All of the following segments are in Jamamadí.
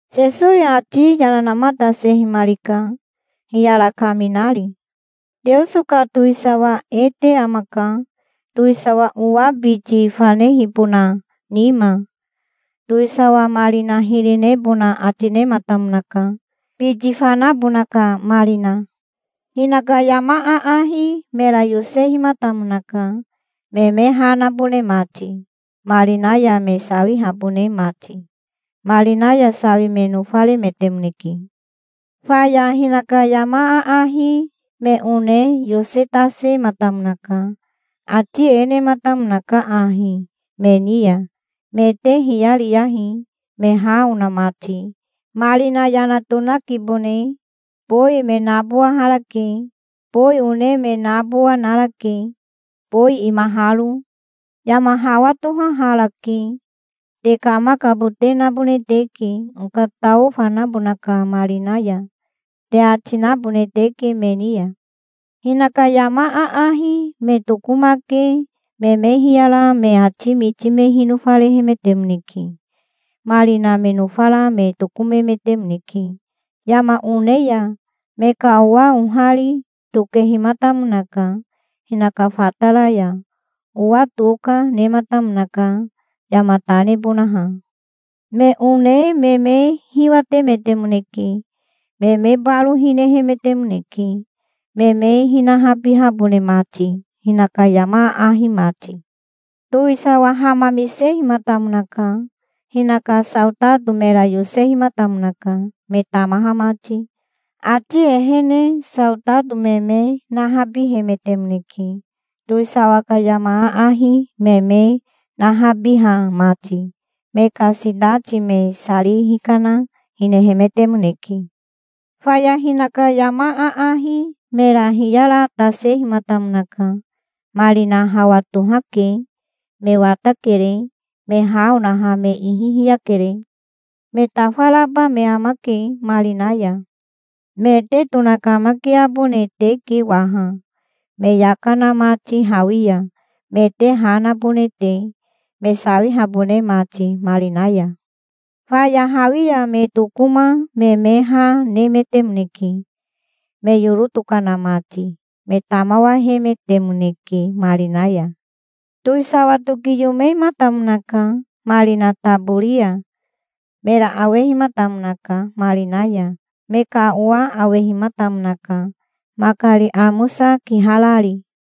Sesowi ati yana namatasehimarika, hiyara kaminari. "Teoso ka towisawa e te amaka, towisawa owa biti fanehibona nima. Towisawa marina hiri nebona ati nematamonaka, biti fanabona ka marina. Hinaka yama aahi mera yosehimatamonaka, me me ha nabone mati, marina ya me sawihabone mati. Marina ya sawi me nofaremetemoneke". "Faya hinaka yama aahi me one yosetasematamonaka. Ati e nematamonaka ahi me ni ya: 'Me te hiyariyahi, me ha ona mati. Marina yana tonakibone. Bowi me nabowaharake. Bowi one me nabowa narake, bowi imaharo. Yama hawa tohaharake. Te kamakabote nabone teke, okatao fanabona ka marina ya', te ati nabone teke me ni ya'". "Hinaka yama aahi me tokomake me me hiyara me ati miti me hinofarehemetemoneke. Marina me nofara me tokomemetemoneke yama one ya. Me ka owa ohari tokehimatamonaka hinaka fatara ya. Owa toka nematamonaka yama ta nebonaha. Me one me me hiwatemetemoneke. Me me baro hinehemetemoneke, me me hinahabihabone mati, hinaka yama aahi mati". "Towisawa hamamisehimatamonaka. Hinaka saotato mera yosehimatamonaka, me tamaha mati. Ati ehene saotato me me nahabihemetemoneke, towisawa ka yama aahi me me nahabiha mati. Me ka sitati me sari hikana hinehemetemoneke". "Faya hinaka yama aahi mera hiyaratasehimatamonaka. 'Marina hawa tohake. Me watakere. Me ha onaha me ihi hiyakere. Me tafaraba me amake marina ya. Me te tonakamakiabone teke waha, me yaka na mati hawi ya, me te ha nabone te, me sawihabone mati marina ya'. Faya hawi ya me tokoma me me ha nemetemoneke, me yoro tokana mati. Me tamawahemetemoneke marina ya". "Towisawa tokiyomematamonaka marina tabori ya. Mera awehimatamonaka marina ya. Me ka owa awehimatamonaka, makari amosa kiharari.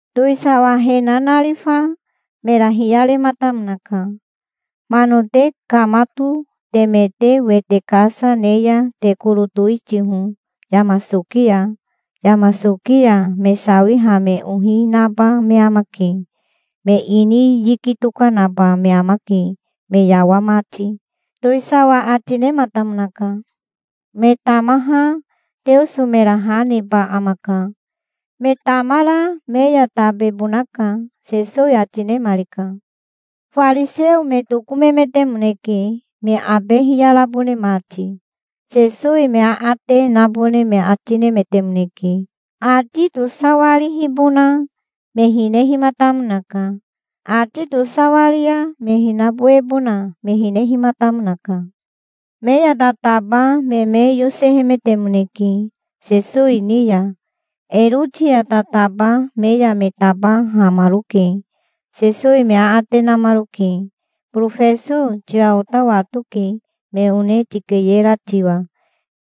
"Towisawa he nanarifa mera hiyarematamonaka. 'Mano te kamato, teme te wete kasa ne ya te koro towitiho yama soki ya. Yama soki ya me sawiha me ohi naba me amake. Me ini yiki tokanaba me amake, me yawa mati', towisawa ati nematamonaka". "Me tamaha Teoso mera ha neba amaka. Me tamara me ya tabebonaka", Sesowi ati nemarika. Fariseo me tokomemetemoneke, me abe hiyarabone mati. Sesowi me aate nabone me ati nemetemoneke. Ati tosawarihibona me hinehimatamonaka. Ati tosawari ya me hinabowebona me hinehimatamonaka. Me ya tataba me me yosehemetemoneke Sesowi ni ya. Eroti ya tataba me ya me tabahamaroke. Sesowi me aate namaroke. "Borofeso tiwa ota watoke, me one tikeyera tiwa.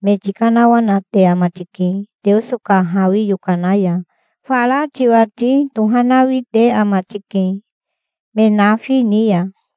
Me tikanawanate ama tike Teoso ka hawi yokana ya. Fara tiwati tohanawi te ama tike me nafi ni ya.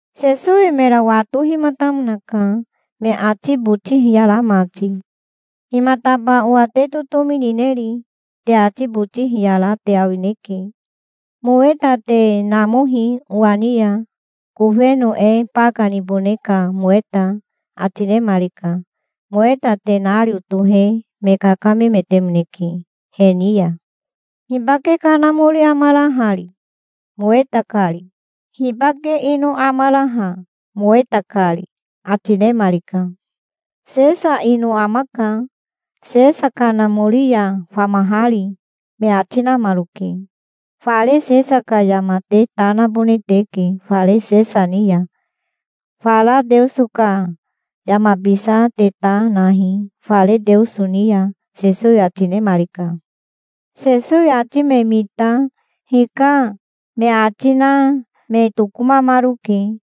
Sesowi mera watohimatamonaka, me ati boti hiyara mati. "Himataba owa te totomi nineri? Te ati boti hiyara te awineke. Moweta te namohi owa ni ya, kofeno e baka nibone ka moweta", ati nemarika. Moweta tenario tohe me kakamemetemoneke he ni ya. "Hibake kanamori amara hari, moweta kari? Hibake ino amara ha, moweta kari?" ati nemarika. "Sesa ino amaka, Sesa kanamori ya famahari", me ati namaroke. "Fare Sesa ka yama te ta nabone teke fare Sesa ni ya. Fara Teoso ka yamabisa te ta nahi fare Teoso ni ya", Sesowi ati nemarika. Sesowi ati me mita "Hika", me ati na me tokomamaroke.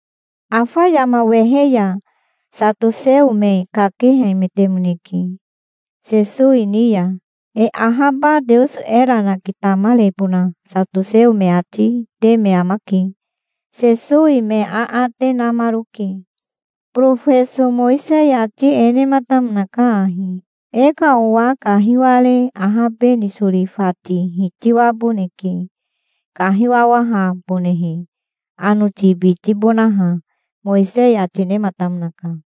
Afa yama wehe ya satoseo me kakehemetemoneke Sesowi ni ya. E ahaba Teoso era nakitamarebona satoseo me ati te me amake. Sesowi me aate namaroke. "Borofeso Mowisei ati e nematamonaka ahi: E ka owa kahiware ahabe nisori fati hitiwaboneke, kahiwawahabonehe, anoti bitibonaha, Mowisei ati nematamonaka.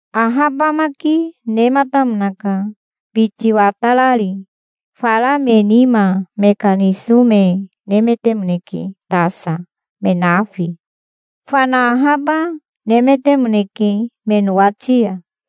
Ahabamaki nematamonaka, biti watarari. Fara me nima me ka niso me nemetemoneke tasa, me nafi. Fana ahaba, nemetemoneke me nowati ya.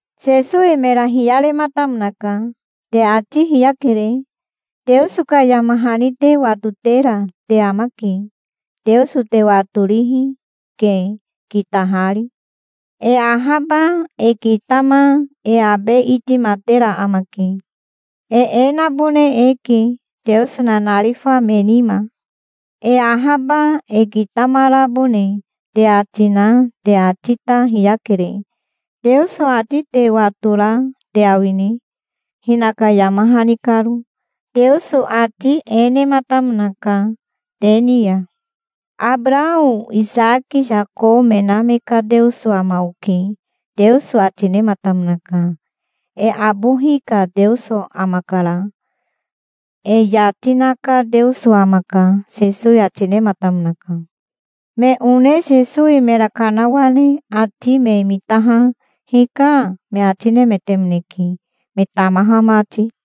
Sesowi mera hiyarematamonaka. "Te ati hiyakere. Teoso ka yama hani te watotera te amake. Teoso te watorihi, ke, kitahari. E ahaba e kitama e abe itimatera amake. E e nabone eke, Teoso nanarifa me nima. E ahaba e kitamarabone te ati na te ati ta hiyakere. Teoso ati te watora te awine, hinaka yama hani karo? Teoso ati e nematamonaka te ni ya: 'Abarao Isaki Yako me na me ka Teoso ama oke', Teoso ati nematamonaka. E abohi ka Teoso amakara. E yati na ka Teoso amaka", Sesowi ati nematamonaka. Me one Sesowi mera kanawane ati me mitaha "Hika", me ati nemetemoneke, me tamaha mati.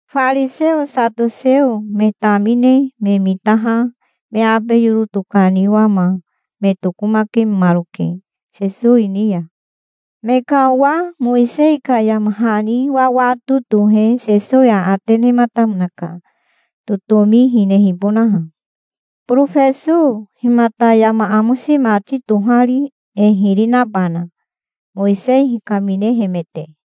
Fariseo satoseo me tamine me mitaha me abe yoro tokaniwama me tokomakemaroke Sesowi ni ya. Me ka owa Mowisei ka yama hani wawato tohe Sesowi aate nematamonaka, totomi hinehibonaha. "Borofeso, himata yama amosi mati tohari e hiri nabana, Mowisei hikaminehemete?"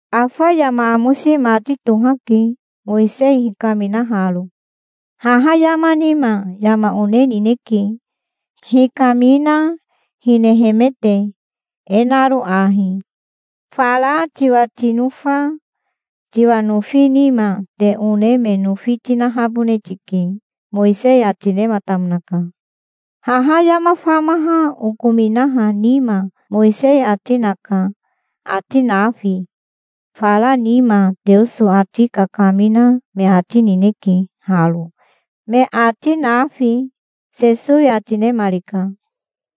Afa yama amosi mati tohake, Mowisei hikaminaharo. Haha yama nima yama one nineke, hikamina hinehemete, e naro ahi: 'Fara tiwa tinofa tiwa nofi nima te one me nofi tinahabone tike', Mowisei ati nematamonaka. Haha yama famaha okominaha nima Mowisei ati naka, ati nafi. Fara nima Teoso ati kakamina me ati nineke haro, me ati nafi", Sesowi ati nemarika.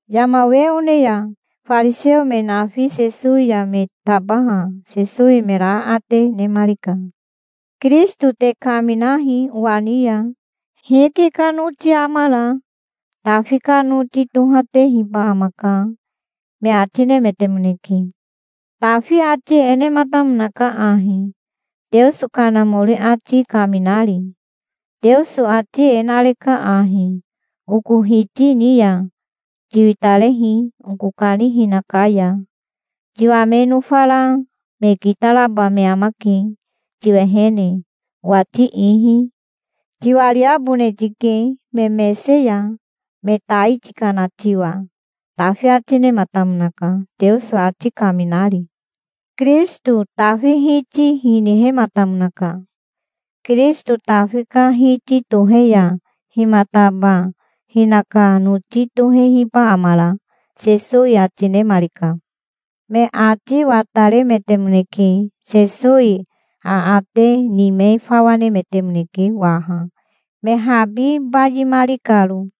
Yama we one ya fariseo me nafi Sesowi ya me tabaha Sesowi mera aate nemarika. "Kirisito te kaminahi owa ni ya. Hike ka noti amara?" "Tafi ka noti tohatehiba amaka", me ati nemetemoneke. "Tafi ati e nematamonaka ahi, Teoso Kanamori ati kaminari: 'Teoso ati e nareka ahi oko Hiti ni ya: "Tiwitarehi oko kanihina ka ya. Tiwa me nofara me kitaraba me amake tiwehene, owati ihi. Tiwariabone tike me mese ya, me tai tikana tiwa"', Tafi ati nematamonaka, Teoso ati kaminari. Kirisito Tafi Hiti hinihematamonaka. Kirisito Tafi ka Hiti tohe ya himataba hinaka noti tohehiba amara?" Sesowi ati nemarika. Me ati wataremetemoneke. Sesowi aate ni me fawa nemetemoneke waha, me habi bayimari karo.